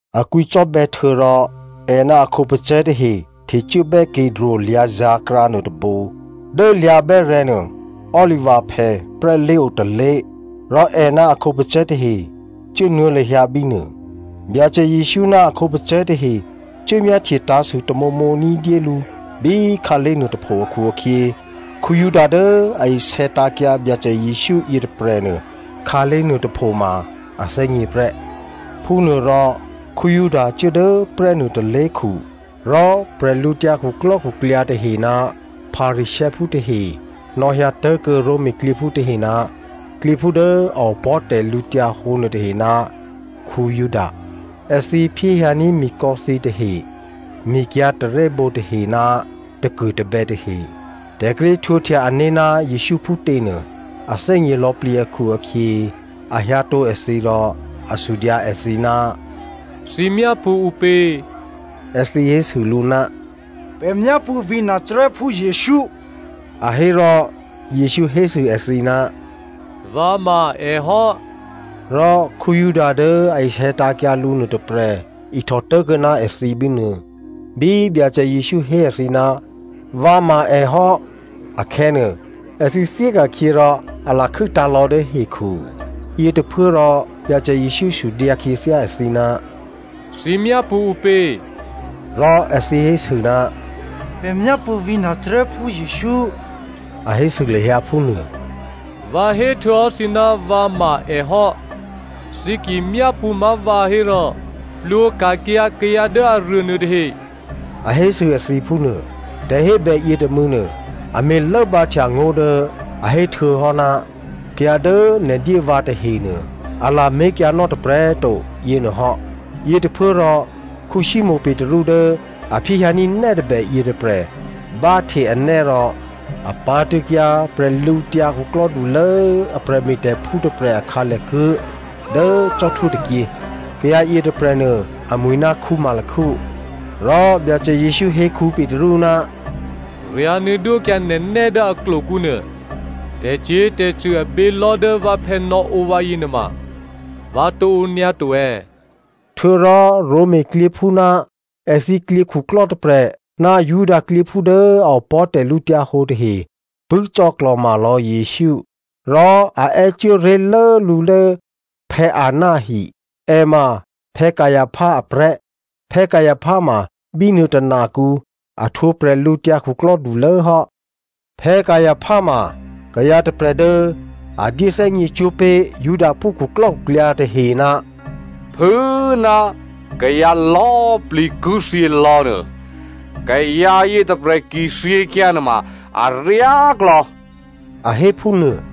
A kwǐcò́bè̌ htuô̌rò è ná a khǒpacè̤̌ tahe htecuốbè́ Kidro lyǎ̤zǎ̤krǎ nuôtôbǒ. Dố lyǎ̤ bè́rè̤̌ nuô, olivaphè prè́lé̤ otôlé̤. Rò è ná a khǒpacè̤̌ tahe cuốnuô̌ lahyǎ bínuô. Byacè Jesǔ ná a khǒpacè̤̌ tahe cuố myáhtye tǎ̤sû tamǒmǒ ní̤dyé lǔ bí khǎlé̤ nuôtôpho akhu-akhyě, Juda dố a isè̌tǎ̤kyǎ Byacè Jesǔ yětôprè̤nuô, khǎlé̤ nuôtôpho ma a thè́gně prè́. Phúnuôrò, Juda cuố dố prè́nuô tôlé̤khu. Rò bwídukhu tahe ná Pharisěophú tahe nò̌hyǎ tố̤kuô̌ Roma klyěphú tahe ná klyěphú dố a opò̤́ tè̤lǔhǒdu nuôtahe ná Juda. Èthǐ phyéhyǎní̤ mikò̌ thǐtahe, mikyǎ̤ tarè́bǒ tahe ná takuô̤tabè̌ tahe. Tè̤ kíré̤ htwǒhtya ané̤ ná Jesǔ phútě nuô, a thè́gně lò̌plǐ akhu-akhyě a hyǎtǒ èthǐ rò a sudyǎ èthǐ, “Thǐ myápṳ̌ ǔpě?” Èthǐ hésû lǔ, “Pè̤ myápṳ̌ vǐ̤ Nazarèphú Jesǔ,” A hé rò Jesǔ hésû èthǐ, “Vǎ ma èhò́.” Rò Juda dố a isè̌tǎ̤kyǎ lǔ nuôtôprè̤ ihtò tố̤kuô̌ ná èthǐ bínuô. Bí Byacè Jesǔ hé èthǐ, “Vǎ ma èhò́,” akhè̌nuô, èthǐ thyéka̤khyě rò a lakhû́tǎ̤ lò̌ dố hekhu. Yětôphuốrò Byacè Jesǔ sudyǎ khyěthyá èthǐ, “Thǐ myápṳ̌ ǔpě?” Rò èthǐ hésû, “Pè̤ myápṳ̌ vǐ̤ Nazarèphú Jesǔ,” a hésû lahyǎ phúnuô. “Vǎ héhtuô̌hò́ thǐ ná vǎ ma èhò́. Thǐ ki myápṳ̌ má̤ vǎ hérò plwǒka̤kyǎ kayǎ dố aruô nuôtahe,” a hésû èthǐ phúnuô. Tè̤hébè yětômû̌nuô, a me̤ lốbǎhtya ngó̤ dố a héhtuô̌hò́, “Kayǎ dố nè̤ dyé vǎ tahenuô, a lamé̤kyǎnò́ tôprè̤꤮ to,” yěnuôhò́. Yětôphuốrò Simonè Petru dố a phyéhyǎní̤ nè́ tôbè yětôprè̤ báhte anè́ rò a pǎ̤tṳ̂̌kyǎ bwídukhulố a prè̤me̤tè̤phú tôprè̤ a khǎlèkuố̤ dố cò́htwó tôkyě. Kayǎ yětôprè̤nuô amwi̤ ná Malko. Rò Byacè Jesǔ hé Petru, “Ryǎ̤nuô̌ dwókyǎ nè̤ nè́ dố aklokǔ nuô. Tè̤cyě̤tè̤cṳ̂ abělò̤́ dố vǎphè̌ nò̌ǒ vǎyě nuôma, vǎ tǒ ǒ nyǎ to è̌?” Htuô̌rò Roma klyěphú ná èthǐ klyěkhuklò́ tôprè̤ ná Juda klyěphú dố a opò̤́ tè̤lǔhǒdu tahe pṳ̂́ cò̌klò̤ma lò̌ Jesǔ. Rò a è́ cuố ré̤lố lǔ dố Anna ahi. È ma Caipha aprè̤́. Caipha ma bínuô tônakǔ a htwǒ bwídukhulố hò́. Caipha ma kayǎ tôprè̤ dố a dyé thè́gněcwó̤ pé̤ Judaphú khuklò́khuklyǎ tahe, “Phû꤮ ná kayǎ lò̌꤮ plǐ ki thyělò̌ nuô, kayǎ yětôprè̤ ki thyěkyǎ nuôma aryáklò̌” a hé phúnuô.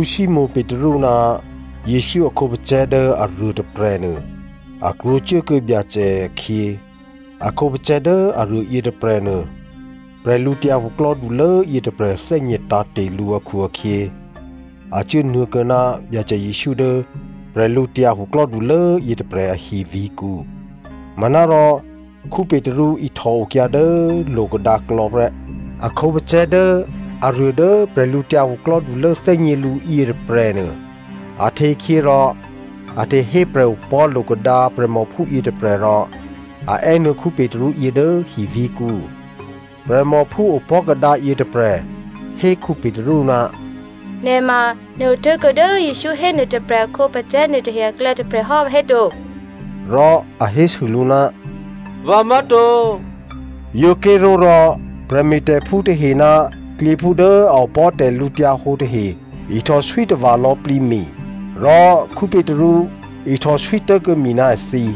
Simonè Petru ná Jesǔ a khǒpacè̤̌ dố aruô tôprè̤nuô, a krwǒcuốkuô̌ Byacè akhyě. A khǒpacè̤̌ dố aruô yětôprè̤nuô, bwídukhulố yětôprè̤ thè́gně tǎ̤te̤ lǔ akhu-akhyě a cuốnuô̌kuô̌ ná Byacè Jesǔ dố bwídukhulố yětôprè̤ ahi vǐ̤kǔ. Manárò Petru ihtò okyǎ dố lo̤kadǎklò̌ prè́. A khǒpacè̤̌ dố aruô dố bwídukhulố thè́gně lǔ yětôprè̤nuô, a htekhyě rò a htehé prè̤opò̤́ lo̤kadǎ prè̤mòphú yětôprè̤ rò a è́nuô̌ Petru yě dố hivǐ̤kǔ. Prè̤mòphú opò̤́ kadǎ yětôprè̤ hé Petru, “Nè̤ ma nè̤ otố̤kuô̌ dố Jesǔ hénuô tôprè̤ a khǒpacè̤̌ nuôtahe aklè̌ tôprè̤ hò́, vǎhéto?” Rò a hésû lǔ, “Vǎ má̤to.” Yǒ ké̤ró̤ rò prè̤me̤tè̤phú tahe ná klyěphú dố a opò̤́ tè̤lǔhǒdu tahe ihtòswí tava̤ lò̌plǐ mi. Rò Petru ihtòswí tố̤kuô̌ mi ná èthǐ.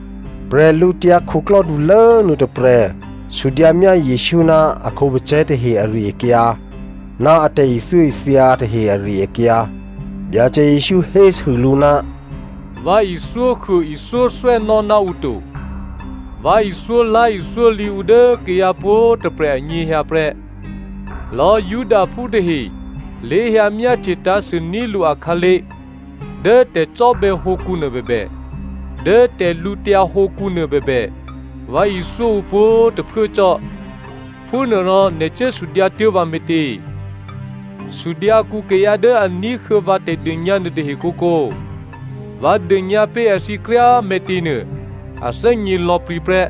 Bwídukhulố nuôtôprè̤ sudyǎmyá Jesǔ ná a khǒpacè̤̌ tahe ari-akyǎ ná a tè̤ithyóithya tahe ari-akyǎ. Byacè Jesǔ hésû lǔ, “Vǎ ithyóhuô ithyóthwè́nò́ ná ǔ to, vǎ ithyólá̤ithyólǐ ǔ dố kayǎ pwǒ̤꤮ tôprè̤ anyěhyǎ prè́. Lò̌꤮ Judaphú tahe lé̤hyǎ myáhtye tǎ̤sû ní̤ lǔ akhǎlé̤ dố tè̤cò́bè̌ hǒkǔ nuô bèbè, dố tè̤lǔtyǎ hǒkǔnuô bèbè vǎ ithyó ǔ pwǒ̤꤮ tôphuố cò́. Phúnuôrò nè̤ cuố sudyǎtuố̤ vǎ me̤tě? Sudyǎkuô̌ kayǎ dố a ní̤huô̌ vǎ tè̤dônyǎ nuôtahe kǒkǒ. Vǎ dônyǎ pé̤ èthǐ kryá꤮ me̤tě nuô, a thè́gně lò̌plǐ prè́,”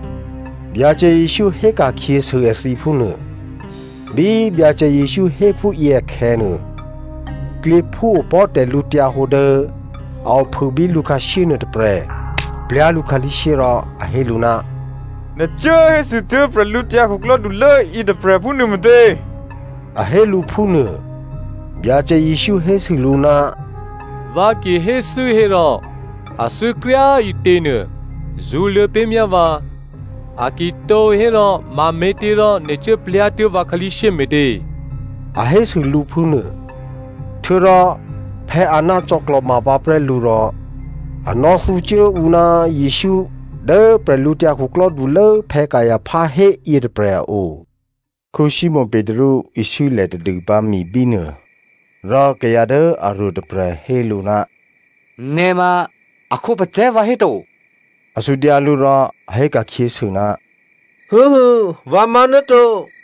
Byacè Jesǔ héka̤khyěsû èthǐ phúnuô. Bí Byacè Jesǔ hé phúyě akhè̌nuô, klyěphú opò̤́ tè̤lǔhǒdu dố a ophû bí lǔkhǎshyé nuôtôprè̤ plyá̤ lǔ khǎlí̤shyé rò a hé lǔ, “Nè̤ cuố hésûtuố̤ bwídukhulố yětôprè̤ phúnuô me̤tě?” A hé lǔ phúnuô. Byacè Jesǔ hésû lǔ, “Vǎ ki hé thû́ hérò a thû́kryá꤮ ǐtěnuô, zṳ̌luô̌ pé̤myá vǎ, a ki tǒ hérò mame̤těrò nè̤ cuố plyá̤tuố̤ vǎ khǎlí̤shyé me̤tě?” A hésû lǔ phúnuô. Htuô̌rò Anna cò̌klò̤ma pǎprè́ lǔ rò a nò̌thǔcuố ǔ ná Jesǔ dố bwídukhulố Caipha hé yětôprè̤ a o. Simonè Petru iswílè̤ tadûpǎ mi bínuô. Rò kayǎ dố aruô tôprè̤ hé lǔ, “Nè̤ ma èkhǒpacè̤̌ vǎhéto?” A sudyǎ lǔ. Rò a hé ka̤khyěsû, “Vǎ má̤ náto.”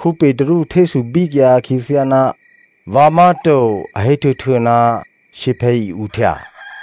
Petru htésû bíkyǎ khyěthyá ná vǎ má̤to a héhtuô̌htuô̌ ná shyěphè̌ i-uhtya.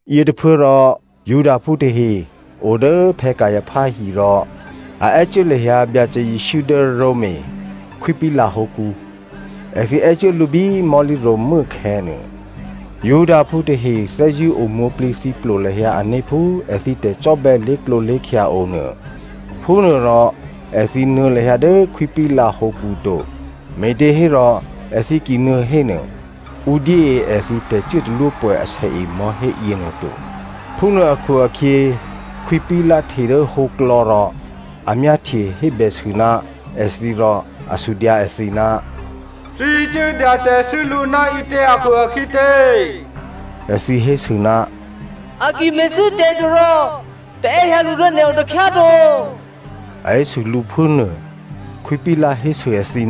Yětôphuốrò Judaphú tahe o dố Caipha hi rò a è́cuố lahyǎ Byacè Jesǔ dố Roma Khwí Pilato hǒkǔ. Èthǐ è́cuố lǔ bí mò̤́lǐ ro̤mû́ akhè̌nuô. Judaphú tahe thè́zṳ̂́ o mwǒ̤plǐthǐplo lahyǎ ané̤ phú èthǐ tè̤cò́bè̌ lé̤klǒlé̤khya o nuô. Phúnuôrò èthǐ nuô̌ lahyǎ dố Khwí Pilato hǒkǔ to, me̤těhérò èthǐ ki nuô̌ hénuô, ǔ dyée èthǐ tè̤cuốtalwópwè̌ asèe mò̤́hé yěnuô to. Phúnuô akhu-akhyě, Khwí Pilato hte dố hǒklò̌ rò a myáhtye hébèsû ná èthǐ rò a sudyǎ èthǐ, “Thǐ cuố dyatè̤thû́ lǔ ná ǐtě akhu-akhyě tě?” Èthǐ hésû, “A ki me̤thû́ tè̤ to rò pè̤ è́hyǎ lǔ dố nè̤o takhyá꤮ to,” a hésû lǔ phúnuô. Khwí Pilato hésû èthǐ,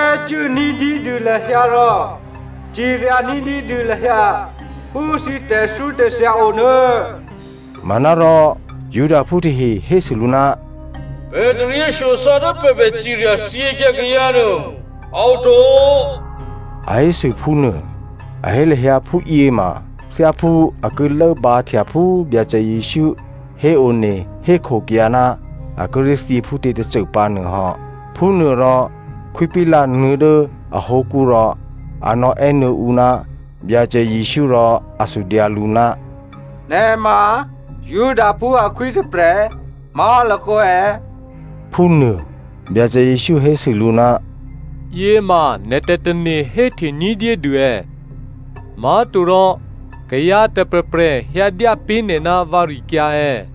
“È́ cuố ní̤dyédû lahyǎ rò cirya ní̤dyédû lahyǎ phú thǐ tè̤thyótè̤thya onuô.” Manárò Judaphú tahe hésû lǔ, “Pè̤ taryěshyosò̌ dố pè̤ bè cirya thyěkyǎ kayǎ nuô, a oto,” a hésû phúnuô. A hé lahyǎ phúyě ma thyáphú a ki lốbǎhtya phú Byacè Jesǔ héone hékhokyǎ ná a kíré̤ thyě phútě tôcô pǎ nuôhò́. Phúnuôrò Khwí Pilato nuô̌ dố ahǒkǔ rò a nò̌è́nuô̌ ǔ ná Byacè Jesǔ rò a sudyǎ lǔ, “Nè̤ ma Judaphú akhwí tôprè̤ má̤lakǒ è̌?” phúnuô. Byacè Jesǔ hésû lǔ, “Yěma nè̤ tè̤tane̤ héhte ní̤dyédû è̌? Má̤torò kayǎ tôprè̤prè̤ hyǎdyá pé̤ nè̤ ná vǎrikyǎ è̌?”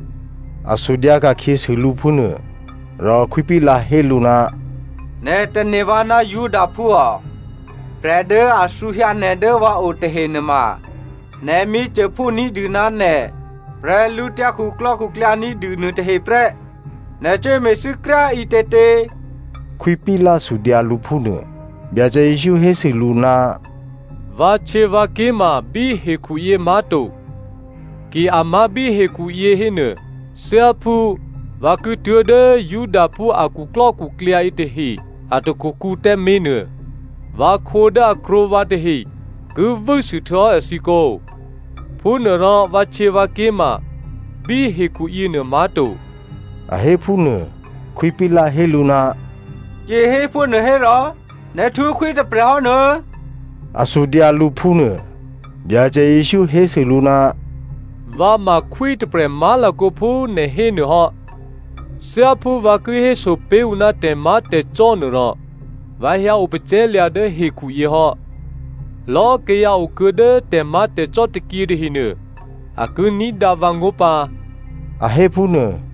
A sudyǎ ka̤khyěsû lǔ phúnuô. Rò Khwí Pilato hé lǔ, “Nè̤ tane̤ vǎ ná Judaphú ò? Prè̤ dố a thǔhyǎ nè̤ dố vǎo tahe nuôma nè̤ myěcôphú ní̤dû ná nè̤ bwídukhu ní̤dû nuôtahe prè́. Nè̤ cuốme̤thû́ kryá꤮ ǐtětě?” Khwí Pilato sudyǎ lǔ phúnuô. Byacè Jesǔ hésû lǔ, “Vǎhtyěvǎké̤ ma bí hekhuyě má̤to. Ki a má̤ bí hekhuyě hénuô, thyáphú vǎ ki tuố̤dố Judaphú a khuklò́khuklyǎ yětahe a takhukǔ tǎmé̤ nuô, vǎkhǒ dố a krwǒkuô̌ vǎ tahe ki vû́sû htuô̌hò́ èthǐ kǒ. Phúnuôrò vǎhtyěvǎké̤ ma bí hekhuyěnuô má̤to.” A hé phúnuô. Khwí Pilato hé lǔ, “Ki héphúnuô hérò nè̤ htwǒ khwí tôprè̤ hò́ nuô̌?” A sudyǎ lǔ phúnuô. Byacè Jesǔ hésû lǔ, “Vǎ ma khwí tôprè̤ má̤lakǒ phú nè̤ hé nuôhò́. Thyáphú vǎ ki hésopé̤ ǔ ná tè̤má̤tè̤cò́ nuôrò, vǎ hyǎ opacè̤̌lya̤ dố hekhuyě hò́. Lò̌꤮ kayǎ okuô̌ dố tè̤má̤tè̤cò́ tôkyě tahenuô a ki ní̤dǎ vǎngó̤ pǎ.” A hé phúnuô.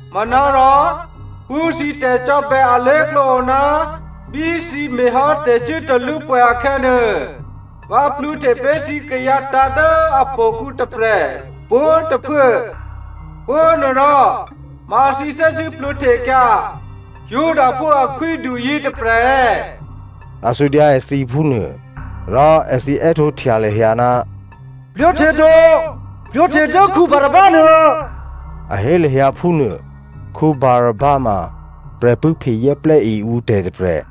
“Manárò phú thǐ tè̤cò́bè̌ alé̤klǒ o ná bí thǐ me̤hò́ tè̤cuốtalwópwè̌ akhè̌nuô, vǎ plwǒhte pé̤ thǐ kayǎ tǎ̤ dố htò̌kǔ tôprè̤ pwǒ̤꤮ tôphuố. Phúnuôrò ma thǐ thè́zṳ̂́ plwǒhtekyǎ ‘Judaphú akhwídu yětôprè̤’ è̌?” A sudyǎ èthǐ phúnuô. Rò èthǐ è́htǒhtya lahyǎ, “Plwǒhte to. Plwǒhte dố Barabba nuô,” a hé lahyǎ phúnuô. Barabba ma prè̤pṳ̂́phe zè́plè́e ǔtè̤ tôprè̤.